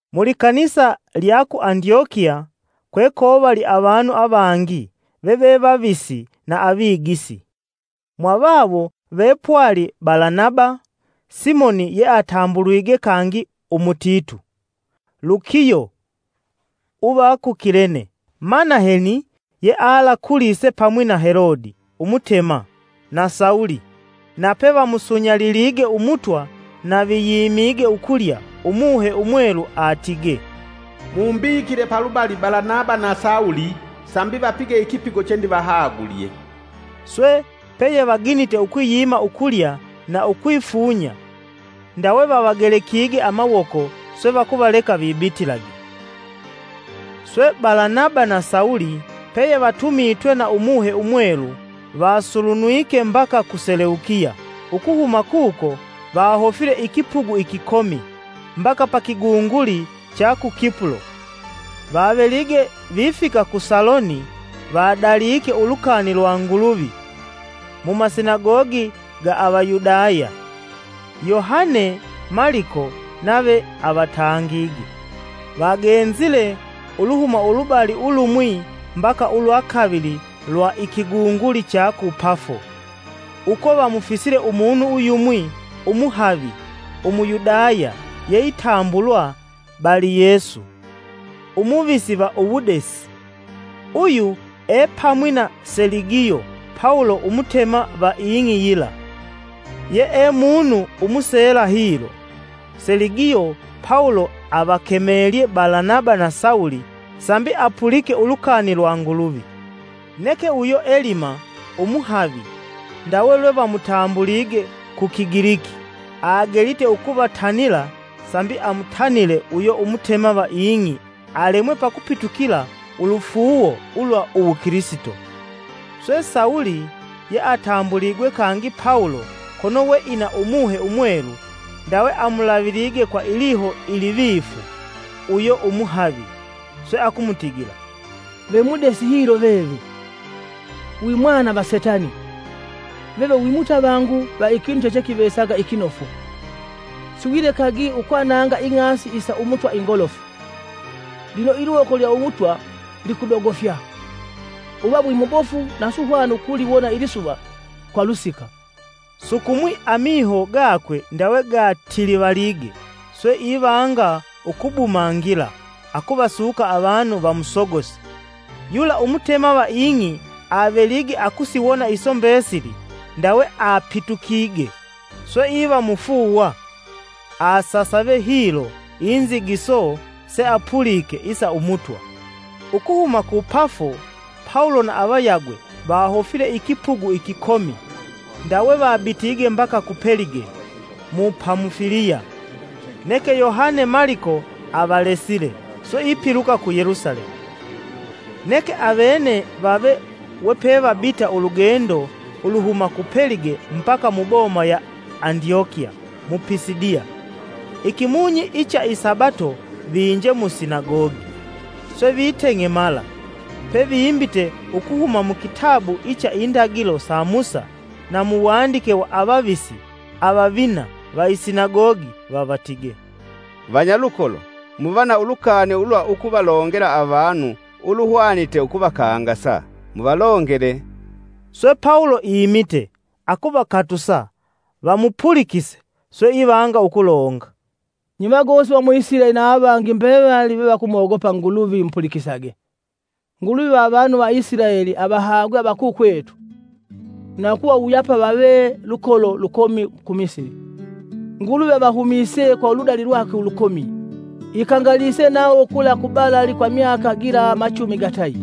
Mu likanisa lya ku Andyokiya kwekovali avanu avangi veve Vavisi na Avigisi, mwavawo ve pwali Balanaba, Simoni yeatambuligwe kangi Umutitu, Lukiyo uva ku Kilene, Manaheni yealakulise pamwi na Helodi Umutema, na Sawulo. Nape vamusunyalilige Umutwa na viyimige ukulya, Umuhe Umwelu atigee, “Mumbikile palubali Balanaba na Sawulo sambi vapige ikipigo chendivahagulye.” Swe, peyevaginite ukwiyima ukulya na ukwifunya, ndawe vavagelekige amawoko, swe vakuvaleka vibitilage. Swe, Balanaba na Sawulo peyevatumitwe na Umuhe Umwelu, vasulunwike mbaka ku Seleukiya ukuhuma kuko vahofile ikipugu ikikomi mbaka pa kigunguli cha ku Kipulo. Vavelige vifika ku Saloni vadalike ulukani lwa Nguluvi mu Masinagogi ga Avayudaya. Yohane (Maliko) nave avatangige. Vagenzile uluhuma ulubali ulumwi mbaka ulwa kavili lwa ikigunguli cha ku Pafo, uko vamufisile umunu uyumwi umuhavi Umuyudaya yeitambulwa Baliyesu umuvisi va uwudesi. Uyu epamwi na Seligiyo Pawulo umutema va ing'i yila, yee munu umuseela hilo. Seligiyo Pawulo avakemelye Balanaba na Sawulo sambi apulike ulukani lwa Nguluvi. Neke uyo Elima, umuhavi (ndawe lwevamutambulige ku Kigiliki), agelite ukuvatanila sambi amutanile uyo Umutema va ing'i alemwe pakupitukila ulufuuwo ulwa uwu Kilisito. Swe, Sawulo yeatambuligwe kangi Pawulo, kono we ina Umuhe Umwelu, ndawe amulavilige kwa iliho ilivifu uyo Umuhavi, swe akumutigila, “Ve mudesi hilo veve! Wi mwana va setani! Veve wi mutavangu va ikinu chechekivesaga ikinofu; siwilekagi ukwananga ing'asi isa Umutwa ingolofu. Lino iliwoko ilya umutwa likudogofya: uva wimubofu na suhwana ukuliwona ilisuva kwa lusika. Sukumwi amiho gakwe ndawe gatilivalige, swe ivanga ukubumangila akuvasuka avanu vamusogose.” Yula umutema va ing'i avelige akusiwona iso mbesili, ndawe apitukige swe iva mufuuwa; asasave hilo inzigiso seapulike isa Umutwa. Ukuhuma ku Pafo, Pawulo na avayagwe vahofile ikipugu ikikomi ndawe vabitige mbaka ku Pelige mu Pamufiliya; neke Yohane (Maliko) avalesile, swe ipiluka ku Yelusalemu. Neke avene vave wepevabita ulugendo uluhuma ku Pelige mbaka muboma ya Andyokiya mu Pisidiya. Ikimunyi icha isabato vinje mu Sinagogi, swe viteng'emala. Pevimbite ukuhuma mukitabu icha indagilo sa Musa na mu wandike wa avavisi, avavina va isinagogi vavatige: “Vanyalukolo muva na ulukani ulwa ukuvalongela avanu ulweluhwanite ukuvakangasa, muvalongele.” Swe, Pawulo imite, akuvakatusa vamupulikise, swe ivanga ukulonga: “Nye vagosi va mu Isilaeli na avangi mbevali vevakumogopa Nguluvi mupulikisage! Nguluvi va avanu va Isilaeli avahagwe avakukwetu na ukuvawuyapa vave lukolo lukomi ku Misili. Nguluvi avahumise kwa uludali lwakwe ulukomi. Ikangalise nawo kula kubalali kwa imyaka gila machumi gatayi.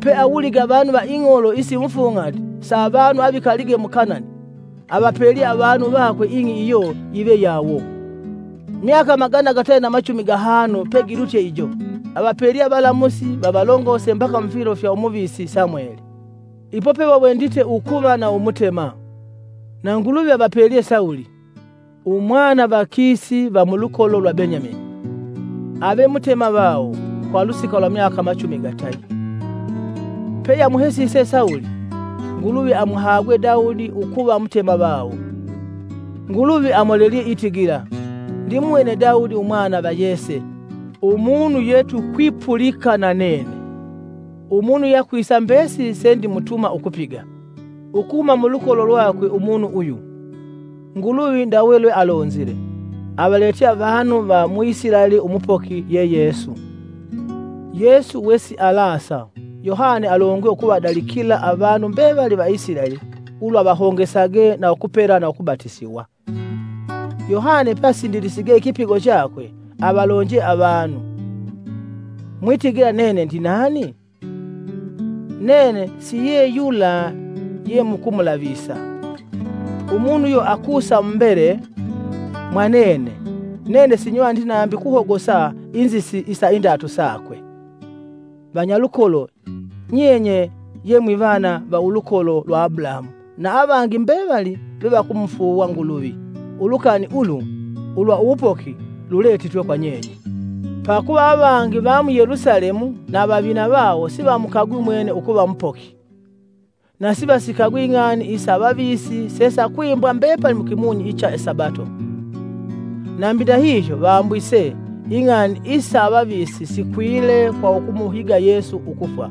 Peawulige avanu va ing'olo isimufung'ati sa avanu avikalige mu Kanani, avapelye avanu vakwe ing'i iyo yive yawo. Myaka magana gatayi na machumi gahanu pegilutye ijo, avapelye avalamusi vavalongose mbaka mufilo fya umuvisi Samweli. Ipo pevawendite ukuva na Umutema, na Nguluvi avapelye Sawulo, umwana va Kisi va mulukolo lwa Benyamini, ave Mutema vawo kwa ulusika lwa myaka machumi gatayi. Peyeamuhesise Sawulo, Nguluvi amuhagwe Dawudi ukuva Mutema vawo. Nguluvi amolelelye itigila: ‘Ndimuwene Dawudi Umwna va Yese; umunu yetukwipulika na nene; umunu yeakwisa mbesili sendimutuma ukupiga.’ Ukuhuma mulukolo lwakwe umunu uyu, Nguluvi, ndawe lwealonzile, avaletye avanu va mu Isilaeli Umupoki, ye Yesu. Yesu wesialasa, Yohane alongwe ukuvadalikila avanu mbevali va Isilaeli ulwa vahongesage na ukupela na ukubatisiwa. Yohane peasindilisige ikipigo chakwe avalonje avanu: ‘Mwitigila nene ndinani? Nene si ye yula yemukumulavisa. Umunu uyo akusa mumbele mwa nene, nene sinywaniti nambi ukuhogosa inzisi isa indatu sakwe.’ “Vanyalukolo, nyenye ye mwivana va ulukolo lwa Abulahamu, na avangi mbevali vevakumufuuwa Nguluvi! Ulukani ulu ulwa uwupoki luletitwe kwa nyenye. Pakuva avangi va mu Yelusalemu na avavina vawo sivamukagwi umwene ukuva Mupoki, na sivasikagwi ing'ani isa avavisi sesakwimbwa mbepali mukimunyi icha isabato. Nambi ndahihyo vambwise ing'ani isa avavisi sikwile kwa ukumuhiga Yesu ukufwa.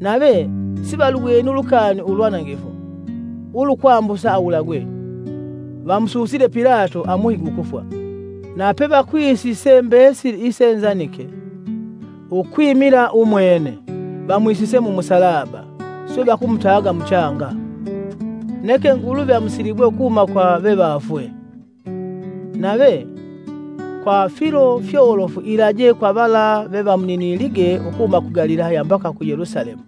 Nave sivaluweni ulukani ulwanangifu ulukwambusa awulagwe, vamususile Pilato amuhige ukufwa. Na pevakwisise mbesili ise nzandike ukwimila umwene, vamwisise mumusalaba, swe vakumutaga muchanga. Neke Nguluvi amusilibwe ukuhuma kwa vevafwe. Nave, kwa filo fyolofu ilaje kwa vala vevamuninilige ukuhuma ku Galilaya mbaka ku Yelusalemu.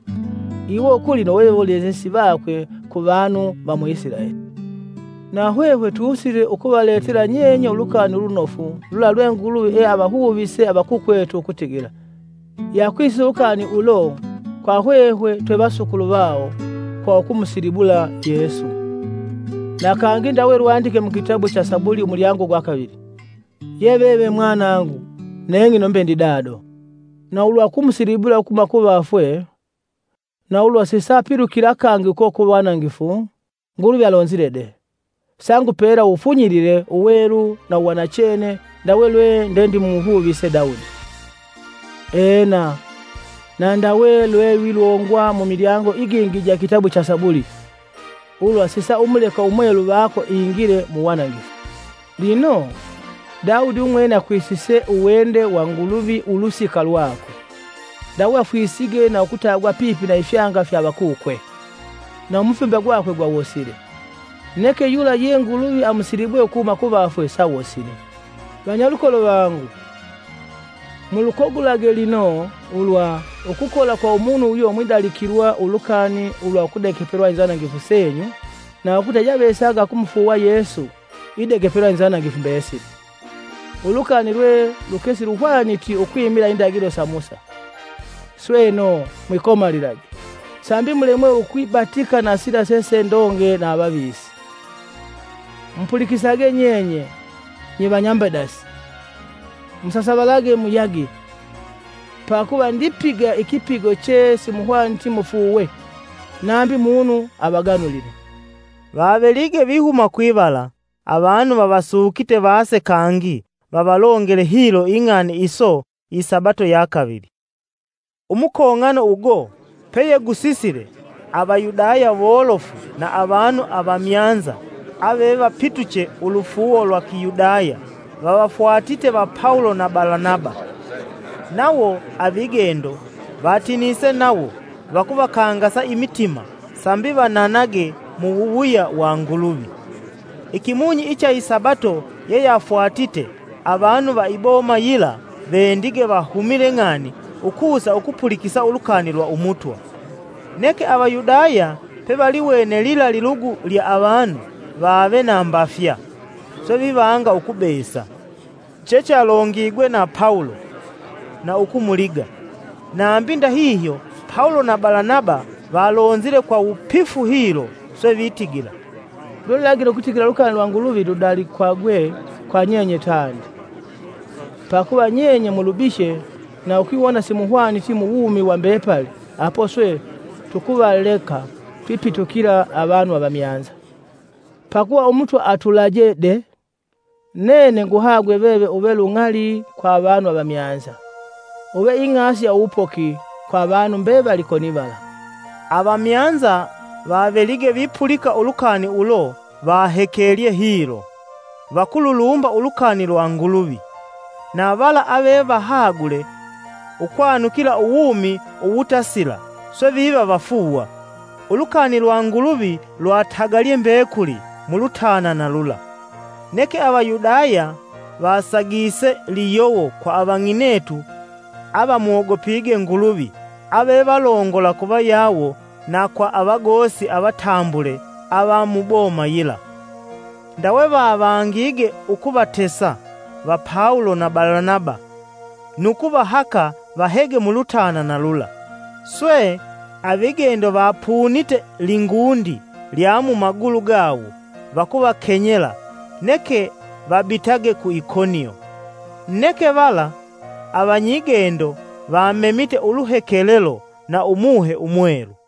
Iwo kulino vewolelesi vakwe ku vanu va mu Isilaeli. Na hwehwe tusile ukuvaletela nyenye Ulukani Ulunofu lula lwe Nguluvi eavahuvise avakukwetu ukutigila: yeakwisise ulukani ulo kwa hwehwe twevasukulu vawo kwa ukumusilibula Yesu. Na kangi ndawe lwandike mukitabu cha Sabuli (inzimbo) umulyango gwa kavili: ‘Ye veve Mwanangu, neng'ino mbe ndi dado.’ Na ulwa ukumusilibula ukuhuma kuvafwe, na ulwa sisaapilukila kangi uko ku wanangifu Nguluvi alonzile de: ‘Sangupela uwufunyilile uwelu na uwanachene ndawe lwe ndendimuhuvise Dawudi.’ Ena, na ndawe lwelwilongwa mumilyango igingi ija ikitabu cha Inzimbo: (Sabuli) ‘Ulwa sisaumuleka Umwelu vako ingile mu wanangifu.’ Lino, Dawudi umwene akwisise uwende wa Nguluvi ulusika lwakwe, ndawe afwisige na ukutagwa pipi na ifyanga fya avakukwe, na umufimba gwakwe gwawosile. Neke yula ye Nguluvi amusilibwe ukuhuma kuvafwe sawosilii. Vanyalukolo vangu, mulukagulage lino ulwa, ukukola kwa umunu uyo mwidalikilwa ulukani ulwa ukudegepelwa inzanangifu senyu na ukuta yeyeavesaga akumufuuwa Yesu idegepelwa inzanangifu mbesili, ulukani lwe lukesiluhwaniti ukwimila indagilo sa Musa. Sweno, mwikomalilage, sambi mulemwe ukwibatika na sila sesendonge na avavisi: ‘Mupulikisage nyenye nyevanyambedasi, musasavalage muyage! Pakuva ndipiga ikipigo che simuhwaniti mufuuwe, nambi munu avaganulile.’” Vavelige vihuma kwivala avanu vavasukite vase kangi vavalongele hilo ing'ani iso isabato ya kavili. Umukong'ano ugo peyegusisile, Avayudaya wolofu na avanu avamyanza avevapituche ulufuuwo lwa Kiyudaya vavafwatite va Pawulo na Balanaba. Nawo avigendo vatinise nawo vakuvakangasa imitima sambi vananage mu wuwuya wa Nguluvi. Ikimunyi icha isabato yeyafwatite, avanu va iboma yila vendige vahumile ng'ani ukusa ukupulikisa ulukani lwa Umutwa. Neke Avayudaya pevaliwene lila lilugu lya avanu vave na mbafya, swe vivanga ukubesa chechalongigwe na Pawulo na ukumuliga. Nambi ndahihyo Pawulo na Balanaba valonzile kwa wupifu hilo, swe vitigila, “Lwe lulagile ukutigila ulukani lwa Nguluvi ludalikwage kwa nyenye tandi, pakuva nyenye mulubihye na ukwiwona simuhwaniti muwumi wa mbepali apo swe tukuvaleka twipitukila avanu avamyanza. Pakuva Umutwa atulaje de: ‘Nene nguhagwe veve uve lung'ali kwa avanu avamyanza, uve ing'asi ya uwupoki kwa avanu mbevali konivala.’” Avamyanza vavelige vipulika ulukani ulo vahekelye hilo, vakululumba ulukani lwa Nguluvi, na vala ave vahagule ukwanukila uwumi uwutasila, swe viva vafuuwa. Ulukani lwa Nguluvi lwatagalye mbekuli mulutanana lula. Neke Avayudaya vasagise liyowo kwa avang'inetu avamwogopige Nguluvi avevalongola kuvayawo na kwa avagosi avatambule ava muboma yila. Ndawe vavangige ukuvatesa va Pawulo na Balanaba nu kuvahaka vahege mulutanana lula. Swe, avigendo vapunite lingundi lya mumagulu gawo vakuvakenyela, neke vabitage ku Ikonio. Neke vala avanyigendo vamemite uluhekelelo na Umuhe Umwelu.